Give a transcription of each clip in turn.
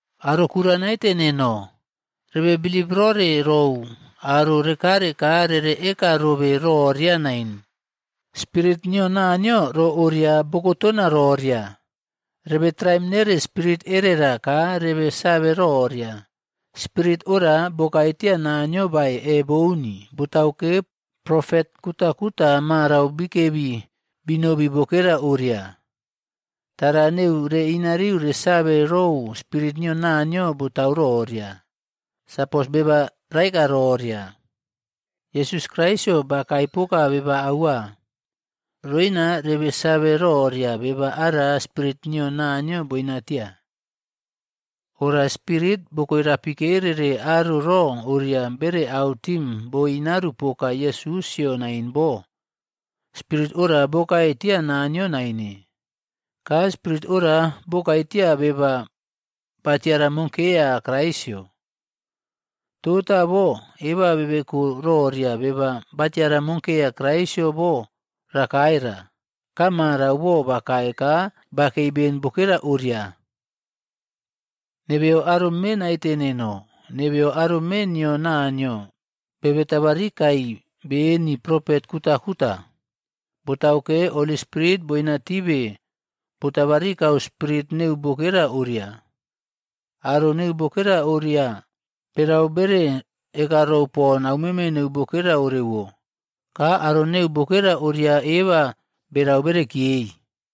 Aro kura naite neno, rebe bilip rore rou aro rekare ka rere eka robe roria nain, “Spirit nio Naniyo ro oria bokotona roria.” Rebe traim nere spirit erera ka rebe save roria, spirit ora bokae tiya Naniyo bae e bouni, botauke, Profet kutakuta marau bikebi binobi bokera oria. Tara neu reꞌinariu resave rou Spirit nio Naniyo botau roria. Sapos beba raeka roria, “Yesus Kraisꞌyo bakae poka beba aua,” roina rebe save roria beba ara spirit nio Naniyo boinatia. Ora spirit bokoirapikerere aro ro oria bere autim boinaru poka Yesusꞌyo nain bo, spirit ora bokae tia Naniyo naine. Ka spirit ora bokae tia beba batiara monkeya Kraisꞌyo. Tota bo eba bebeko roria beba batiramokeya Yesusꞌyo bo rakae ra. Ka marau bo bakae ka bakei ben bokera oria. Nebeyo aro mee naite neno, nebeyo aro mee nio Naniyo, bebe tabarikai beni profet kutakuta. Botauke, Holy Spirit boinatibe botabarikau spirit neu bokera oria. Aro neu bokera oria, berau bere ekarou pon aumeme neu bokera orewo, ka aro neu bokera oria eba berau berekiyei.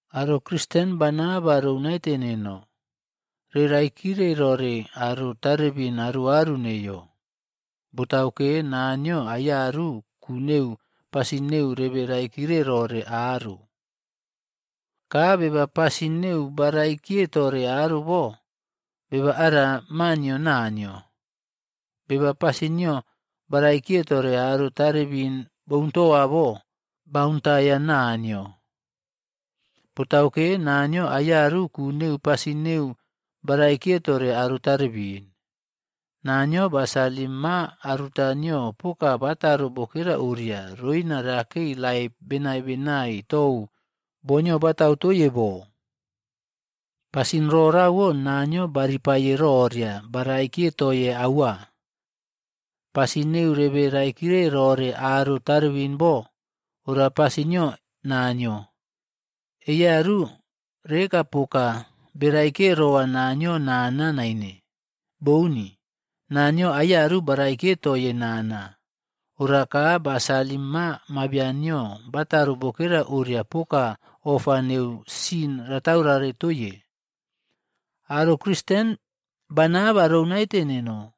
Aro Kristen bana ba rou naite neno, reꞌraikire rore aro tarebin aruaru neiyo. Botauke, Naniyo aiyaru ku neu pasin neu rebe raikire rore aro. Ka beba pasin neu baꞌraikiye tore aro bo, beba ara maa nio Naniyo. Beba pasin nio baꞌraikiye tore aro tarebin bountowa bo, bauntaiya Naniyo. Botauke, Naniyo aiyaru ku neu pasin neu baraikiye tore aro tarebin. Naniyo ba salim maa aruta nio poka bataro bokera oria, roina rekei laip benai benai tou boo nio batautoiye bo. Pasin rorauwo Naniyo baripaiye roria baraikiye toye aua. Pasin neu rebe raikiye rore aro tarebin bo, ora pasin nio Naniyo. Eiyaru reꞌekapoka beraikiye rowa Naniyo nana naine. Bouni! Naniyo ayaru baraikiye toiye nana. Ora ka ba salim Maa Mabian nio bataro bokera oria poka ofa neu sin rataurare toiye. Aro Kristen bana ba rou naite neno,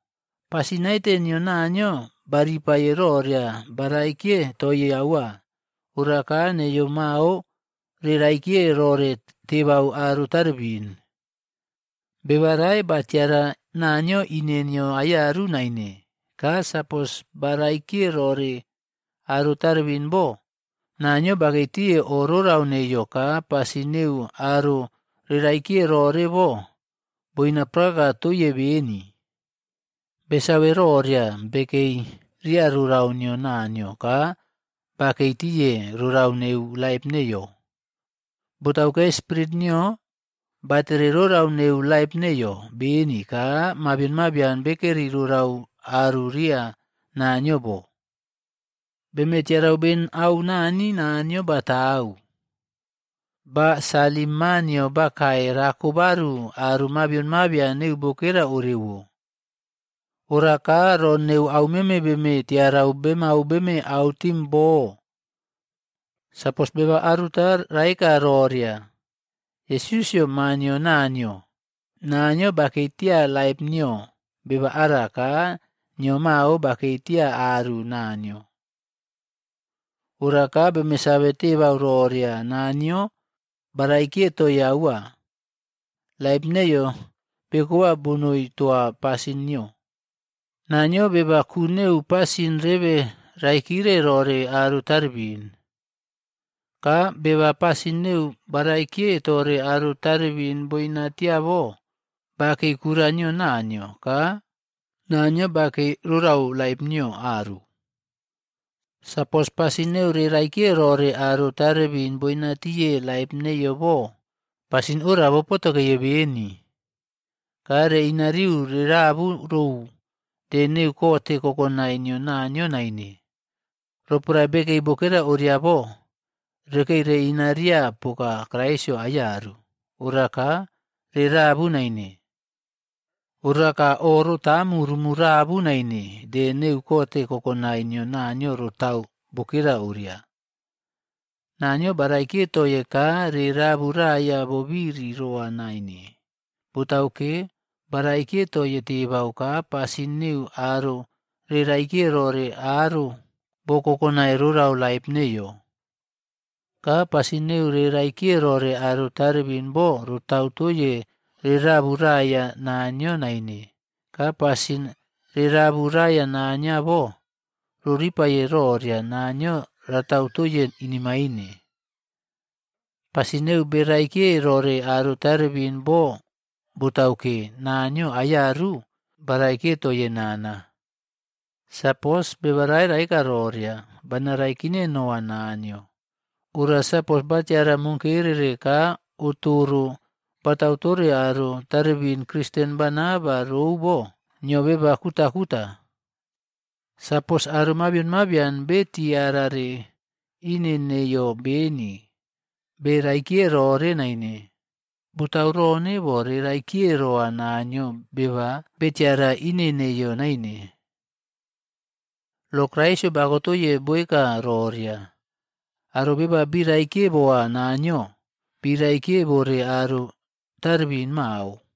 pasin naite nio Naniyo baripaiye roria baraikiye toye aua. Ora ka neiyo mao reꞌraikiye rore tebau aro tarebin. Beba rae batiara Naniyo ine nio aiyaru nain. Ka sapos beraikiye rore aro tarebin bo, Naniyo bakei tiye o rorau neiyo ka pasin neu aro reꞌraikiye rore bo, boina prakaka toiye beni. Besave roria bekei ria rorau nio Naniyo ka bakei tiye rorau neu laip neiyo. Botauke, Spirit nio batere rorau neu laip neiyo beni ka mabion mabian bekeri rorau aru ria Naniyo bo. Beme tiarau beni au Nani Naniyo batau. Ba salim Maa nio bakae rako baru aro mabion mabian neu bokera oriawo. Ora ka ro neu aumeme beme tiarau bemau beme autim bo. Sapos beba aruta raeka roria, “Yesusꞌyo Maa nio Naniyo,” Naniyo bakei tia laip nio beba ara ka nio mao bakei tia aru Naniyo. Ora ka beme save tebau roria, Naniyo baraikiye toiye aua. Laip neiyo bekowa bonoi towa pasin nio. Naniyo beba ku neu pasin rebe raikire rore aro tarebin. Ka beba pasin neu baraikiye tore aro tarebin boina tia bo, bakei kura nio Naniyo, ka Naniyo bakei rorau laip noi aru. Sapos pasin neu reꞌraikiye rore aro tarebin bonaite tiye laip neiyo bo pasin ora bopotokeye beni. Ka reꞌinariu rerabu rou de neu kote kokonai nio Naniyo naine. Roporae bekei bokera oria bo, rekei reꞌinariya poka Kraisꞌyo aiyaru, oraka re rabu naine. Oraka o rotaamu rumu rabu naine de neu kote kokonai nio Naniyo rotau bokera oria. Naniyo baraikiye toiye ka re raburaya bobiri roa naine. Botauke, baraikiye toye tebau ka pasin neu aro reꞌraikiye rore aro bokokonai rorau laip neiyo. Ka pasin neu reꞌraikiye rore aro tarebin bo rotau toye rerabu raiya Naniyo naine. Ka sapos rerabu raiya Naniyo bo, roripaiye roria Naniyo ratau toiye inemaine. Pasin neu beraikiye rore aro tarebin bo botauke, Naniyo aiyaru baraikiye toiye nana. Sapos beba rae baeka roria, “Bana raikine noa Naniyo,” ora sapos batiara monkerere ka otoro batautore aro tarebin kristen bana ba rou bo, nio beba kutakuta. Sapos aro mabion mabian betiarare ine nio beni beraikiye rore naine, botauronebo reꞌraikiye roa Naniyo beba betiara ine neiyo naine. Lo Kraisꞌyo bakotoiye boeka roria, aro beba biraikiye boa Naniyo, biraikiye bore aro tarebin mao.